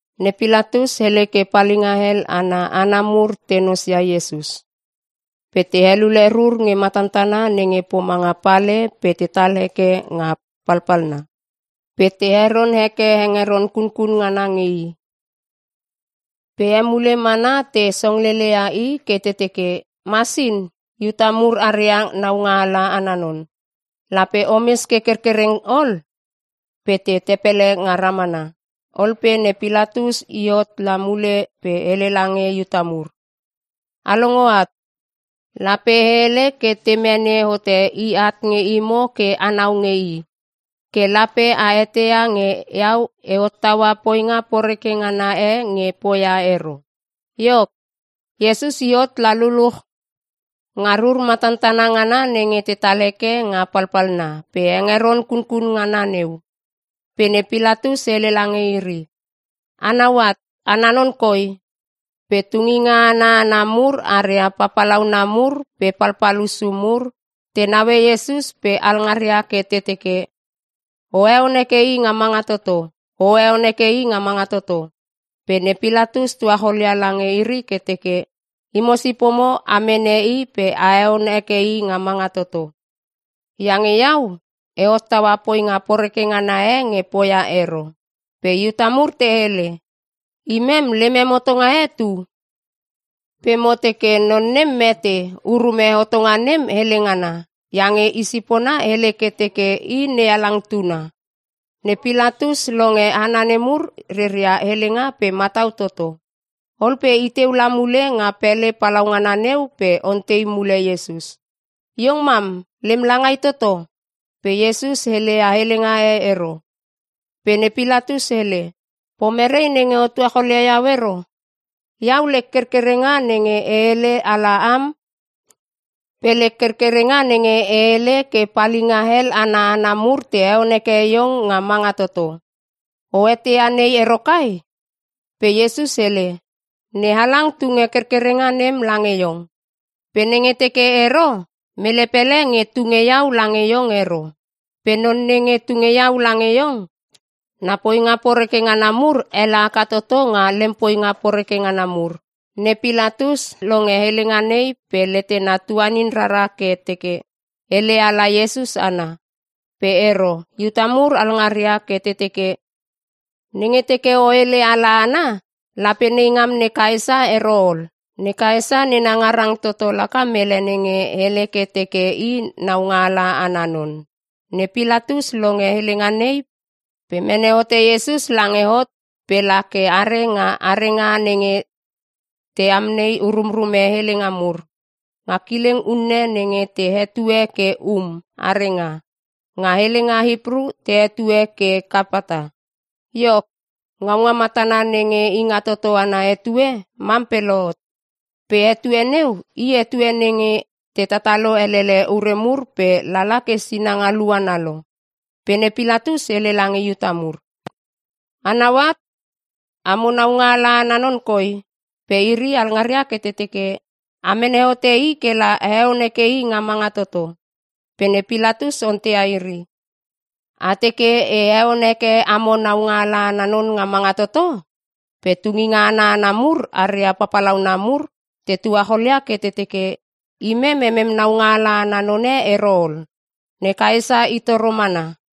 Ne Pilatus hele ke palinga hel ana hana mur te nosia Iesus. Pe te helule rur nge matantana nenge pomanga pale pe tetal heke nga palpalna pe te heron heke hengeron kunkun ngana nge i. Pe emule mana te songlele ia i ke te teke, “Masin! Iuta mur aria naungaala ana non! Lape omes ke kerkereng ol!” Pe te tepele nga ramana. Ol pe ne Pilatus i hot la mule pe hele lange Iuta mur, “A longo at! Lape e hele ke te mene hote i at nge imo ke anau nge i. Ke lape a eteia nge iau e hottaua poinga poreke ngana e nge poia ero.” Iok, Iesus i hot la luluch nga rur matantana ngana nenge tetal heke nga palpalna pe hengeron kunkun ngana neu. Pe ne Pilatus hele lange iri, “Anau at ana non koi!” Pe tunginga ana hana mur aria papalauna mur pe palpal hussu mur te naue Iesus pe alngaria ke te teke, “O heon heke i nga manga toto! O heon heke i nga manga toto!” Pe ne Pilatus tuacholia lange iri ke teke, “Imo sipomo a mene i pe a heon heke i nga manga toto. Iange iau, e hottaua poinga poreke ngana e nge poia ero.” Pe Iuta mur te hele, “Imem lemem hotonga e tu. Pe mo teke non nem mete urume hotonga nem hele ngana iange i sipona hele ke teke i NeHalang Tuna.” Ne Pilatus longe hana nemur reria helenga pe matau toto. Ol pe iteu la mule nga pele palaungana neu pe ontei mule Iesus, “Iong mam lem langai toto?” Pe Iesus heleia helenga e ero. Pe ne Pilatus hele, “Pomerei nenge o tuacholia iau ero? Iau lek kerkerenga nenge e hele ala am pe lek kerkerenga nenge e hele ke palinga hel ana hana mur te heon heke iong nga manga toto. O eteia nei ero kai?” Pe Iesus hele, “NeHalang tunge kerkerenga nem lange iong. Pe nenge teke ero mele pele nge tunge iau lange iong ero. Pe non nenge tunge iau lange iong, na poinga poreke ngana mur ele haka toto nga lem poinga poreke ngana mur.” Ne Pilatus longe helenga nei pe letena tuanin rara ke teke hele ala Iesus ana. Pe ero Iuta mur alngaria ke te teke, “Nenge teke o hele ala ana lape neingam ne Kaesa ero ol. Ne Kaesa nena ngarang toto laka mele nenge hele ke teke i naungaala ana non.” Ne Pilatus longe helenga nei pe mene hote Iesus lange hot pe la ke are nga arenga nenge te amnei urumrume helenga mur. Nga kileng unne nenge te hetue ke Um Arenga. Nga helenga Hipru te hetue ke Kapata. Iok, ngaunga matana nenge Ingatoto ana etue mam pe lohot. Pe etue neu i etue nenge te tatalo elele ure mur pe lala ke sinanga luana lo. Pe ne Pilatus hele lange Iuta mur, “Anau at amo naungaala ana non koi.” Pe iri alngaria ke te teke, “A mene hote i kela aheon heke nga manga toto.” Pe ne Pilatus onteia iri, “A teke e heon heke amo naungaala ana non nga manga toto?” Pe tunginga ana hana mur aria papalauna mur te tuacholia ke te teke, “Imem emem naungaala ana none ero ol, ne Kaesa i toro mana.”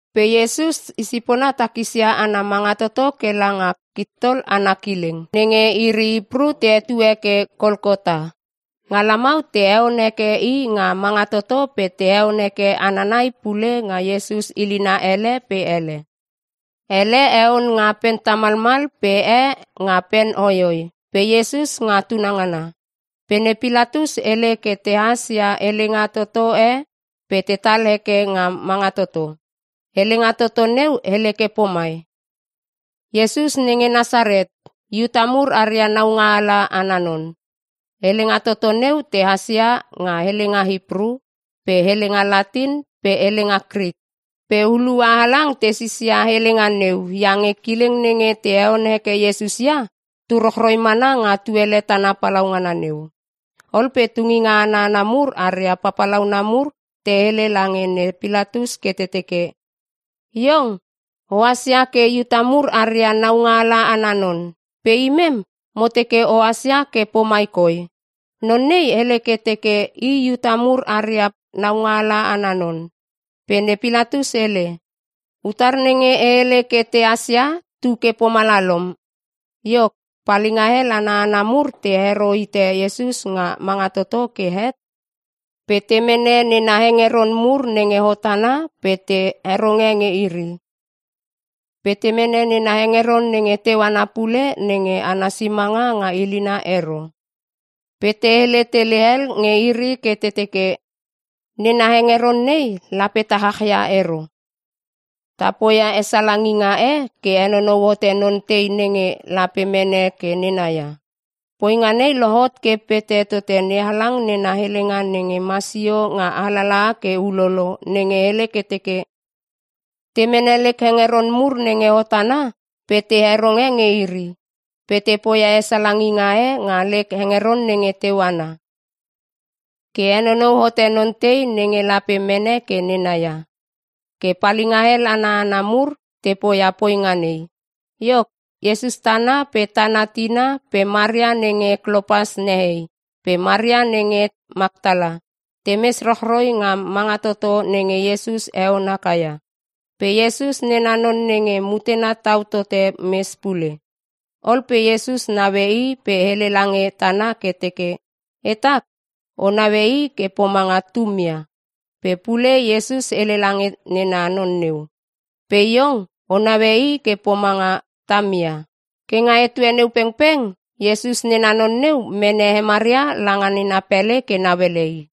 Pe Iesus i sipona takisia ana manga toto kela nga Kittol ana kileng (nenge iri Hipru te hetue ke Kolkota.) Nga lamau te heon heke i nga manga toto pe te heone hana nai pule nga Iesus ilina ele pe ele. Elle heon nga pen tamalmal pe e nga pen hoihoi pe Iesus nga tunangana. Pe ne Pilatus hele ke tehas ia helenga toto e pe tetal heke nga manga toto. Helenga toto neu hele ke pomai, “IESUS NENGE NASARET, IUTA MUR ARIA NAUNGAALA ANA NON.” Helenga toto neu tehas ia nga helenga Hipru pe helenga Latin pe helenga Krik. Pe hulua halang te sisia helenga neu iange kileng nenge te heon heke Iesus ia, tu rochroi mana nga tuele tana palaungana neu. Ol pe tunginga ana hana mur aria papalauna mur te hele lange ne Pilatus ke te teke, “Iong ohas ia ke ‘Iuta mur aria naungaala ana non’. Pe imem mo teke ohas ia ke pomai koi, ‘Non nei hele ke teke i Iuta mur aria naungaala ana non.’” Pe ne Pilatus hele, “Utar nenge e hele ke tehas ia tu ke pomalalom.” Iok, palinga hel ana hana mur te hero hite Iesus nga manga toto ke het pe te mene nena hengeron mur nenge hot ana pe te heronge nge iri. Pe te mene nena hengeron nenge teu ana pule nenge ana simanga nga ilina ero. Pe te hele tele hel nge iri ke te teke, “Nena hengeron nei lape ta chachia ero. Ta poia hesalanginga e ke henonou hote non tei nenge lape mene ke nena ia.” Poinga nei lohot ke pete tote NeHalang nena helenga nenge masio nga alalaha ke ulolo nenge hele ke teke, “Te mene lek hengeron mur nenge hot ana pe te heronge nge iri. Pe te poia hesalanginga e nga lek hengeron nenge teu ana ke henonou hote non tei nenge lape mene ke nena ia.” Ke palinga hel ana hana mur te poia poinga nei. Iok, Iesus tana pe tana tina pe Maria nenge Klopas nehei pe Maria nenge Maktala, temes rochroi nga manga toto nenge Iesus heon haka ia. Pe Iesus nena non nenge mutena tau tote mes pule. Ol pe Iesus naue i pe hele lange tana ke teke, “Etak o naue i ke pomanga tumia.” Pe pule Iesus hele lange nena non neu, “Pe iong o naue i ke pomanga tamia.” Ke nga etue neu pengpeng Iesus nena non neu mene he Maria langa nena pele ke nauele i.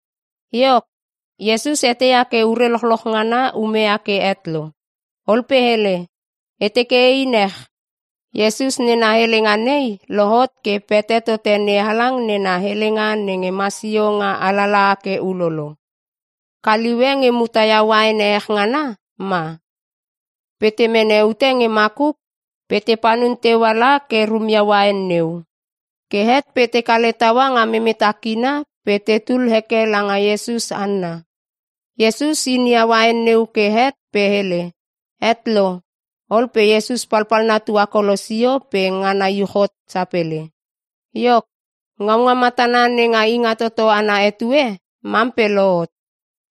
Iok, Iesus eteia ke ure lochloch ngana umeia ke het lo. Ol pe hele, “E teke ein ech.” Iesus nena helenga nei lohot ke pete tote NeHalang nena helenga nenge masio nga alalaha ke ulolo. Kaliu e nge muta ia uain ehech ngana ma. Pe te mene ute nge makuk pe te panun teua la ke rumia uain neu. Ke het pe te kale taua nga memeta kina pe tetul heke langa Iesus hanna. Iesus inia uain neu ke het pe hele, “Het lo.” Ol pe Iesus palpalna tuakolo sio pe ngana iuch hot sapele. Iok, ngaunga matana nenga Ingatoto ana etue mam pe lohot.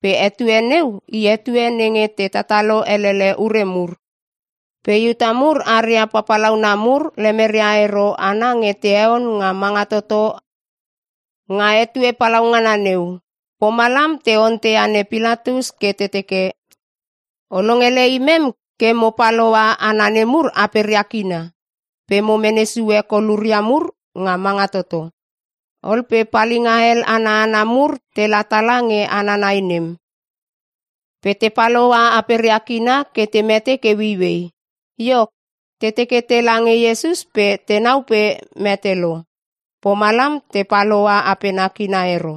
Pe etue neu i etue nenge te tatalo elele ure mur. Pe Iuta mur aria papalauna mur lemeria ero hana nge te heon nga manga toto nga etue palaungana neu. Pomalam te onteia ne Pilatus ke te teke, “O longele imem ke mo pal hoa hana nemur aperia kina pe mo mene sue koluria mur nga manga toto.” Ol pe palinga hel ana hana mur tela tala nge hana nai nem pe te pal hoa aperia kina ke te mete ke ueiuei. Iok, te teke tela nge Iesus pe tenau pe mete lo. Pomalam te pal hoa apena kina ero.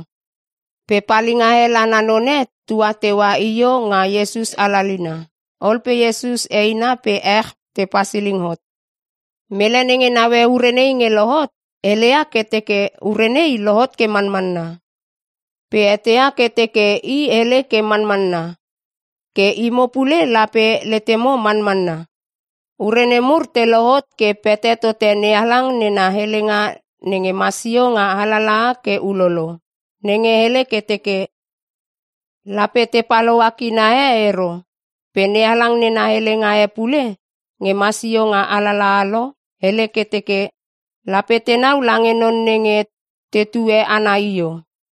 Pe palinga hel ana none tua teua io nga Iesus alalina. Ol pe Iesus eina pe ech te pasiling hot. Mele nenge naue ure nei nge lohot heleia ke teke ure nei lohot ke manmanna. Pe eteia ke teke i hele ke manmanna. Ke imo pule lape letemo manmanna. Ure nemur te lohot ke pete tote NeHalang nena helenga nenge masio nga alalaha ke ulolo, nenge hele ke teke, “Lape te pal hoa kina e ero.” Pe NeHalang nena helenga e pule nge masio nga alalaha lo hele ke teke, “Lape tenau lange non nenge tetue ana io.”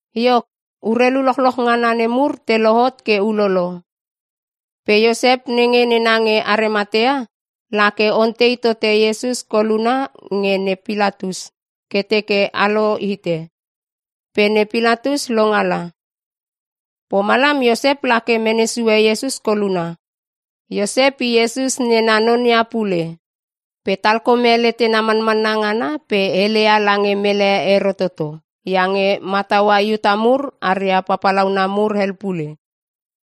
Iok, urelu lochloch ngana nemur te lohot ke ulo pe Iosep nenge nena nge Arimatea lake ontei tote Iesus koluna nge ne Pilatus ke teke alo hite. Pe ne Pilatus longala. Pomalam, Iosep lake mene sue Iesus koluna. Iosep i Iesus nena non ia pule pe talkome letena manmanna ngana pe heleia lange mele ero toto iange mataua Iuta mur aria papalauna mur hel pule.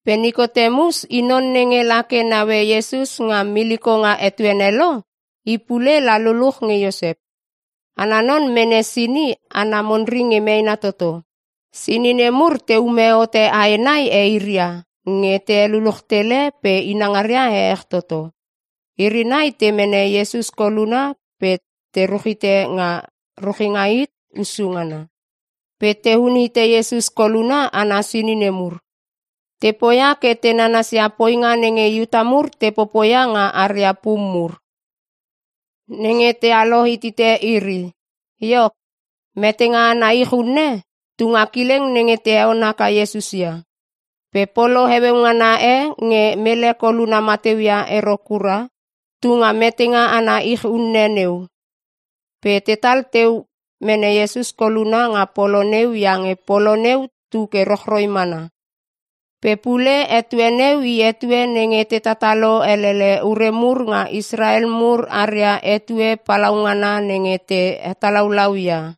Pe Nikotemus i non nenge lake naue Iesus nga miliko nga etuene lo, i pule la luluch nge Iosep. Ana non mene sini ana monri nge meena toto. Sini nemur teume hote ae nai eiria nge te heluluch tele pe inangaria ehech toto. Iri nai te mene Iesus koluna pe te ruchite nga ruchinga hit hussu ngana. Pe teun hite Iesus koluna ana sini nemur. Te poia ke te nanasia poinga nenge Iuta mur te popoia nga aria pum mur, nenge tealo hitite iri. Iok, metenga ana ich unne tunga kileng nenge te heon haka Iesus ia. Pe polo heueu ngana e nge mele koluna mateu ia ero kura, tunga metenga ana ich unne neu. Pe tetal teu mene Iesus koluna nga polo neu iange polo neu tu ke rochroi mana. Pe pule etue neu i etue nenge te tatalo elele ure mur nga Israel mur aria etue palaungana nenge te hetalaulau ia.